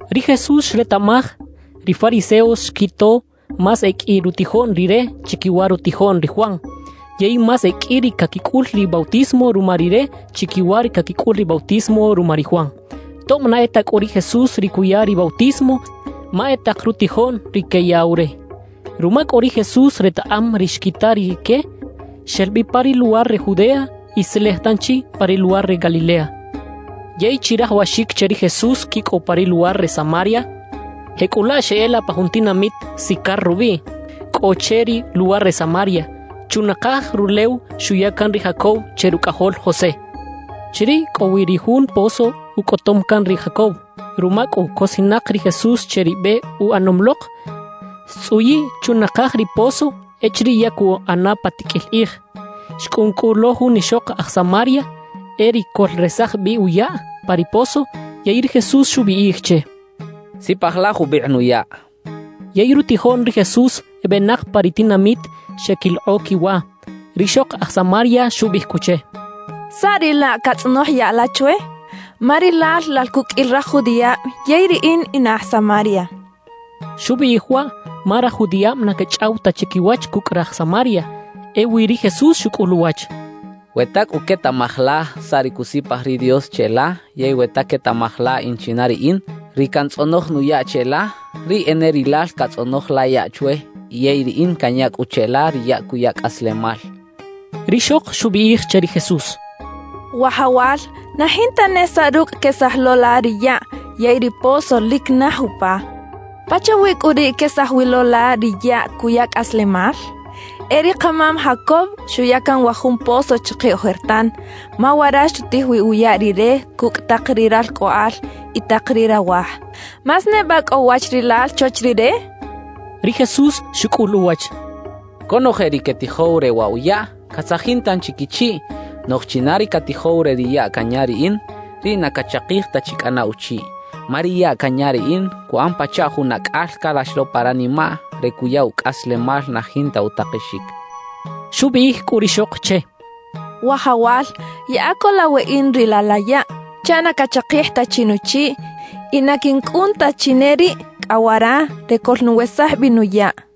Ri Jesús xretaꞌmaj, ri fariseos xquito más e qꞌui rutijoꞌn Rire chiquiwa rutijoꞌn ri Juan, yey más e qꞌui ri caquicꞌul ri bautismo ruma Rire chiquiwa ri caquicꞌul ri bautismo ruma ri Juan. (Tob na e ta cꞌu ri Jesús ri cuya ri bautismo, ma e tak rutijoꞌn ri queyaꞌw re.) Ruma cꞌu ri Jesús retaꞌam ri xquita rique, xel bi pa ri luwar re Judea y xtzelej tanchi pa ri luwar re Galilea. Yey chirajawaxic che ri Jesús quicꞌow pa ri luwar re Samaria. Jecꞌulaꞌ xeꞌela pa jun tinamit Sicar rubiꞌ, cꞌo che ri luwar re Samaria, chunakaj rulew xuya can ri Jacob che rucꞌajol José. Chiriꞌ cꞌo wi ri jun pozo ucꞌotom can ri Jacob. Ruma cꞌu cosinak ri Jesús che ri be uꞌanom lok, xtzꞌuyiꞌ chunakaj ri pozo echiriꞌ ya cuꞌana pa tiqꞌuil kꞌij. Xcꞌun cꞌu lo jun ixok aj Samaria, e riꞌ coꞌlresaj bi uyaꞌ pa ri pozo, yey ri Jesús xubiꞌij che: —Sipaj la jubikꞌ nuyaꞌ —xchaꞌ. Yey rutijoꞌn ri Jesús ebenak pa ri tinamit xeꞌquilokꞌo quiwa. Rixok aj Samaria xubiꞌij cꞌu che: —¿Saꞌ riꞌ laꞌ catzꞌonoj yaꞌ la chwe? Ma rilal lal cuqꞌuil raj judiꞌab yey riꞌin in aj Samaria —xchaꞌ. Xubiꞌij waꞌ ma raj judiꞌab na quechꞌaw ta chiquiwach cucꞌ raj Samaria. Ewi ri Jesús xucꞌul uwach: —We ta cꞌu quetaꞌmaj la saꞌ ri cusipaj ri Dios cheꞌla yey we ta quetaꞌmaj la in china riꞌin, ri cantzꞌonoj nuyaꞌ cheꞌla, riꞌ e ne rilal catzꞌonoj la yaꞌ chwe yey riꞌin canya cꞌu cheꞌla ri yaꞌ cuya cꞌaslemal —xchaꞌ. Rixok xubiꞌij che ri Jesús: —Wajawal, na jinta ne saꞌ rucꞌ quesaj lo la ri yaꞌ yey ri pozo lic naj upa. ¿Pachawi cꞌu riꞌ quesaj wi lo la ri yaꞌ cuya cꞌaslemal? E ri kamam Jacob xuya can wa jun pozo chike ojertan, ma wara xutij wi uyaꞌ rire cucꞌ tak ri ralcꞌoꞌal y tak ri rawaj. ¿Más neba cꞌo wach rilal chwach rire? —xchaꞌ. Ri Jesús xucꞌul uwach: —Conoje ri quetijow re waꞌ wa yaꞌ, catzajin tanchi quichiꞌ. Noꞌj china ri catijow re ri yaꞌ canya riꞌin, riꞌ na cachakij ta chi cꞌana uchiꞌ. Ma ri yaꞌ canya riꞌin, cuꞌan pachaꞌ jun acꞌal calax lo pa ranimaꞌ re cuya ucꞌaslemal na jinta utakexic —xchaꞌ. Xubiꞌij cꞌu rixok che: —Wajawal, yaꞌa co la weꞌin riꞌ laꞌ la yaꞌ, chaꞌ na cachakij ta chi nuchiꞌ y na quincꞌun ta chi ne riꞌ cꞌa wara re coꞌlnuwesaj bi nuyaꞌ —xchaꞌ.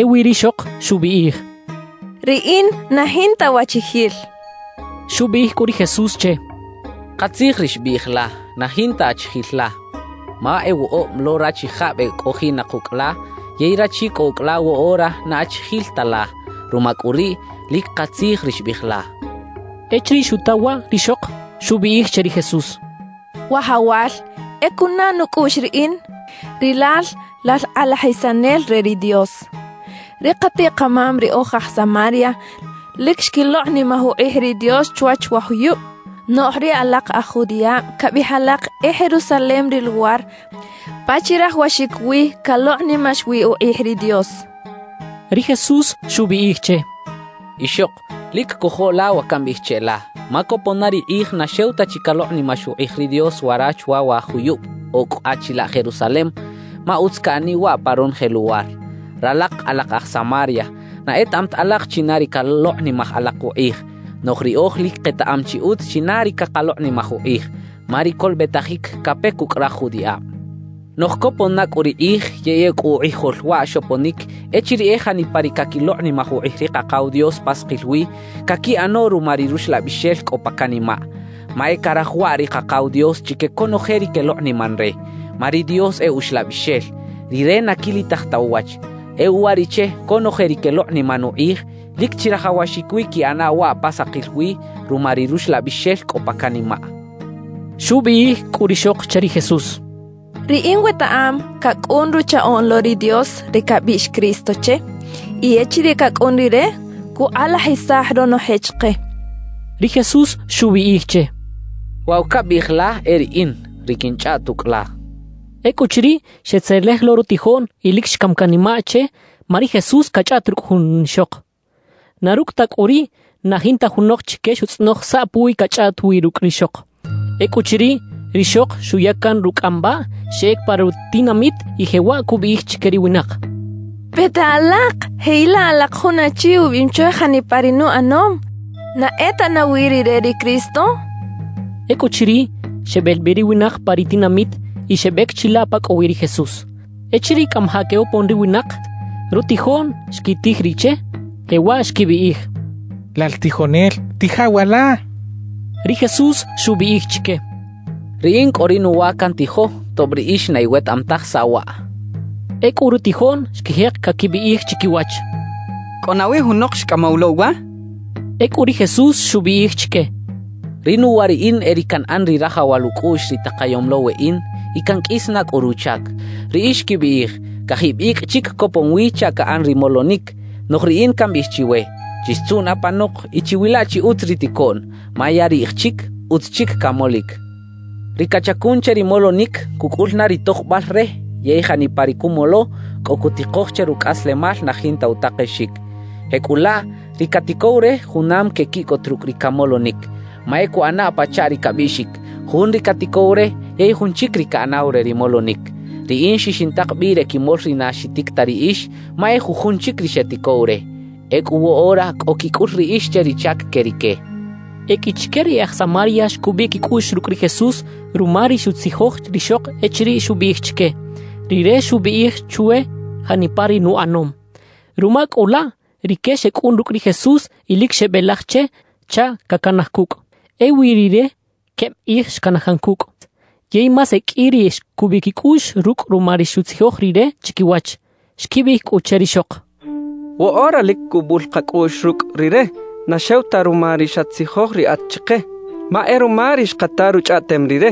Ewi rixok xubiꞌij: —Riꞌin na jinta wachijil —xchaꞌ. Xubiꞌij cꞌu ri Jesús che: —Katzij ri xbiꞌij la, na jinta achijil la. Ma e woꞌob lo rachijab e cꞌojiꞌnak ucꞌ la yey rachi cꞌo ucꞌ la woꞌora na achijil ta la. Ruma cꞌu riꞌ, lic katzij ri xbiꞌij la —xchaꞌ. Echiriꞌ xuta waꞌ rixok, xubiꞌij che ri Jesús: —Wajawal, e cunaꞌ nucꞌuꞌx riꞌin, rilal lal kꞌalajisanel re ri Dios. Ri katiꞌ-kamam ri oj aj Samaria lic xquilokꞌnimaj ukꞌij ri Dios chwach wa juyub, noꞌj ri alak aj judiꞌab cabiꞌij alak e Jerusalem ri luwar pa chirajawaxic wi calokꞌnimax wi ukꞌij ri Dios —xchaꞌ. Ri Jesús xubiꞌij che: —Ixok, lic cojo la wa cambiꞌij cheꞌla, ma copon na ri kꞌij na xew ta chi calokꞌnimax ukꞌij ri Dios wara chwa wa juyub o cꞌa chilaꞌ Jerusalem, ma utz caꞌaniꞌ waꞌ pa ronoje luwar. Ralak alak aj Samaria, na etaꞌam ta alak china ri calokꞌnimaj alak ukꞌij; noꞌj riꞌoj lic ketaꞌam chi utz china ri cakalokꞌnimaj ukꞌij, ma ri colobetajic cape cucꞌ raj judiꞌab. Noꞌj copon na cꞌu ri kꞌij yey ecꞌu ukꞌijol waꞌ xoponic echiriꞌ e janipa ri caquilokꞌnimaj ukꞌij ri Kakaw Dios pa sakil wi, caquiꞌano ruma ri Ruxlabixel cꞌo pa canimaꞌ. Ma e caraj waꞌ ri Kakaw Dios chique conoje ri quelokꞌniman re. Ma ri Dios e Uxlabixel; Rire na quilitaj ta uwach. E uwariꞌche conoje ri quelokꞌniman ukꞌij, lic chirajawaxic wi quiꞌana waꞌ pa sakil wi ruma ri Ruxlabixel cꞌo pa canimaꞌ —xchaꞌ. Xubiꞌij cꞌu rixok che ri Jesús: —Riꞌin wetaꞌam cacꞌun Ruchaꞌoꞌn lo ri Dios, ri cabiꞌx “Cristo” che; y echiriꞌ cacꞌun Rire, cukꞌalajisaj ronoje chike —xchaꞌ. Ri Jesús xubiꞌij che: —Waꞌ wa cabiꞌij la e riꞌin, ri quinchꞌaꞌt ucꞌ la —xchaꞌ. Ecꞌuchiriꞌ, xetzelej lo rutijoꞌn y lic xcam canimaꞌ che ma ri Jesús cachꞌaꞌt rucꞌ jun ixok. Na rucꞌ ta cꞌu riꞌ, na jinta junok chique xutzꞌonoj saꞌ puwiꞌ cachꞌaꞌt wi rucꞌ rixok. Ecꞌuchiriꞌ, rixok xuya can rucꞌambaꞌ, xeꞌec pa ri tinamit y jewaꞌ cubiꞌij chique ri winak: —Peta alak, jeꞌilaꞌ alak jun achi ubiꞌim chwe janipa ri nuꞌanom. ¿Na e ta nawi rire ri Cristo? —cachaꞌ. Ecꞌuchiriꞌ, xebel bi ri winak pa ri tinamit y xebec chilaꞌ pa cꞌo wi ri Jesús. Echiriꞌ cꞌamajaꞌ quebopon ri winak, rutijoꞌn xquitij riꞌ che, jewaꞌ xquibiꞌij: —Lal tijonel, tija wa la —xecha che. Ri Jesús xubiꞌij chique: —Riꞌin cꞌo ri nuwa cantijo, tob riꞌix na iwetaꞌam taj saꞌ waꞌ —xchaꞌ. Ecꞌu rutijoꞌn xquijek caquibiꞌij chiquiwach: «¿Cꞌo nawi junok xcꞌamaw lo uwa?» xechaꞌ. Ecꞌu ri Jesús xubiꞌij chique: «Ri nuwa riꞌin e ri canꞌan ri rajawal ucꞌuꞌx ri takayom lo weꞌin y canqꞌuis na cꞌu ruchac. Riꞌix quibiꞌij: “Cajib icꞌ chic copon wi chaꞌ caꞌan ri molonic.” Noꞌj riꞌin cambiꞌij chiwe: Chixtzuꞌn apanok y chiwila chi utz ri ticoꞌn, ma ya riꞌj chic, utz chic camolic. Ri cachacun che ri molonic, cucꞌul na ri tojbal re yey janipa ri cumolo, cꞌo cutikoj che rucꞌaslemal na jinta utakexic. Jecꞌulaꞌ, ri caticow re junam quequiꞌcot rucꞌ ri camolonic. Ma e cuꞌana pachaꞌ ri cabiꞌxic: “Jun ri caticow re yey jun chic ri caꞌanaw re ri molonic.” Riꞌin xixintak bi re quimol ri na xitic ta riꞌix; ma e jujun chic ri xeticow re. Ecꞌu woꞌora cꞌo quicꞌul riꞌix che ri chac que rique» xchaꞌ. E qꞌui chique ri e aj Samaria xcubiꞌ quicꞌuꞌx rucꞌ ri Jesús ruma ri xutzijoj rixok echiriꞌ xubiꞌij chique: «Rire xubiꞌij chwe janipa ri nuꞌanom.» Ruma cꞌu laꞌ, rique xecꞌun rucꞌ ri Jesús y lic xebelaj che chaꞌ cacanaj cucꞌ. Ewi Rire queb kꞌij xcanaj can cucꞌ. Yey más e qꞌui ri xcubiꞌ quicꞌuꞌx rucꞌ ruma ri xutzijoj Rire chiquiwach. Xquibiꞌij cꞌu che rixok: —Woꞌora lic cubul kacꞌuꞌx rucꞌ rire na xew ta ruma ri xatzijoj riꞌat chike, ma e ruma ri xkata ruchꞌaꞌtem rire.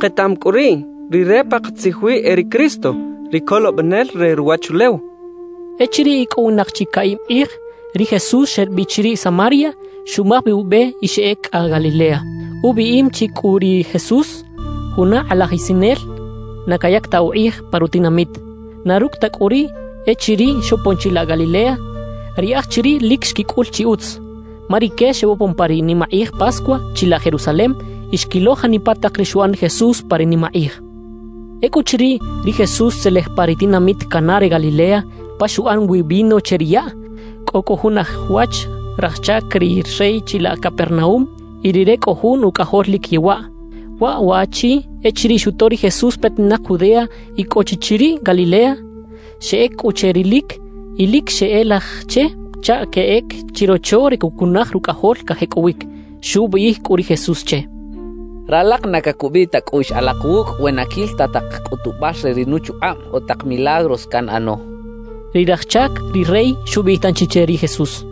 Ketaꞌam cꞌu riꞌ rire pakatzij wi e ri Cristo, ri Colobenel re ruwachulew —xechaꞌ. Echiriꞌ icꞌowinak chi caꞌib kꞌij, ri Jesús xel bi chiriꞌ Samaria, xumaj bi ube y xeꞌec cꞌa Galilea. Ubiꞌim chi cꞌu ri Jesús: “Juna kꞌalajisanel na cayac ta ukꞌij pa rutinamit.” Na rucꞌ ta cꞌu riꞌ, echiriꞌ xopon chilaꞌ Galilea, ri aj chiriꞌ lic xquicꞌul chi utz, ma rique xebopon pa ri nimakꞌij Pascua chilaꞌ Jerusalem y xquilo janipa tak ri xuꞌan ri Jesús pa ri nimakꞌij. Ecꞌuchiriꞌ, ri Jesús xtzelej pa ri tinamit Caná re Galilea pa xuꞌan wi vino che ri yaꞌ. Cꞌo cꞌu jun aj wach raj chac ri rey chilaꞌ Capernaúm, y rire cꞌo jun ucꞌajol lic yewaꞌ. Wa waꞌchi echiriꞌ xuto ri Jesús petinak Judea y cꞌo chi chiriꞌ Galilea, xeꞌec cꞌu che rilic y lic xeꞌelaj che chaꞌ queꞌec chirocho re cuꞌcunaj rucꞌajol cajecꞌowic. Xubiꞌij cꞌu ri Jesús che: —Ralak na cacubiꞌ ta cꞌuꞌx alak wucꞌ we na quil ta tak cꞌutubal re ri nuchukꞌab o tak milagros canꞌano —xchaꞌ. Ri raj chac ri rey xubiꞌij tanchi che ri Jesús: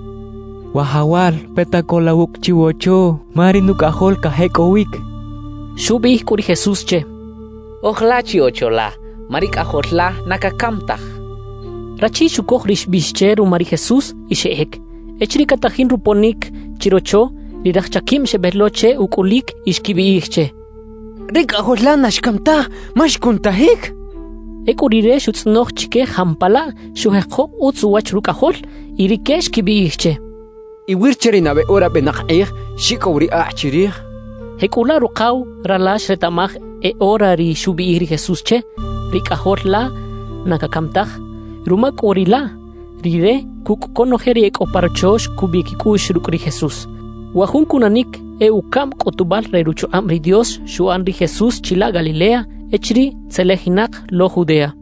—Wajawal, peta co la wucꞌ chiwocho, ma ri nucꞌajol cajecꞌowic —xchaꞌ. Xubiꞌij cꞌu ri Jesús che: —Oj la chi ocho la, ma ri cꞌajol la na cacam taj —xchaꞌ. Rachi xucoj ri xbiꞌx che ruma ri Jesús y xeꞌec. Echiriꞌ catajin roponic chirocho, ri raj chaquib xebel lo che ucꞌulic y xquibiꞌij che: —¡Ri cꞌajol la na xcam taj ma xcunutajic! —xechaꞌ. Ecꞌu rire xutzꞌonoj chique jampalaꞌ xujeko utz uwach rucꞌajol. Y rique xquibiꞌij che: —Iwir che ri nabe ora benak kꞌij xicꞌow ri akꞌ chirij —xechaꞌ. Jecꞌulaꞌ rukaw rala xretaꞌmaj e ora riꞌ xubiꞌij ri Jesús che: «Ri cꞌajol la na cacam taj.» Ruma cꞌu riꞌ laꞌ, rire cucꞌ conoje ri e cꞌo pa rocho xcubiꞌ quicꞌuꞌx rucꞌ ri Jesús. Wa jun cunanic e ucaꞌm cꞌutubal re ruchukꞌab ri Dios xuꞌan ri Jesús chilaꞌ Galilea echiriꞌ tzelejinak lo Judea.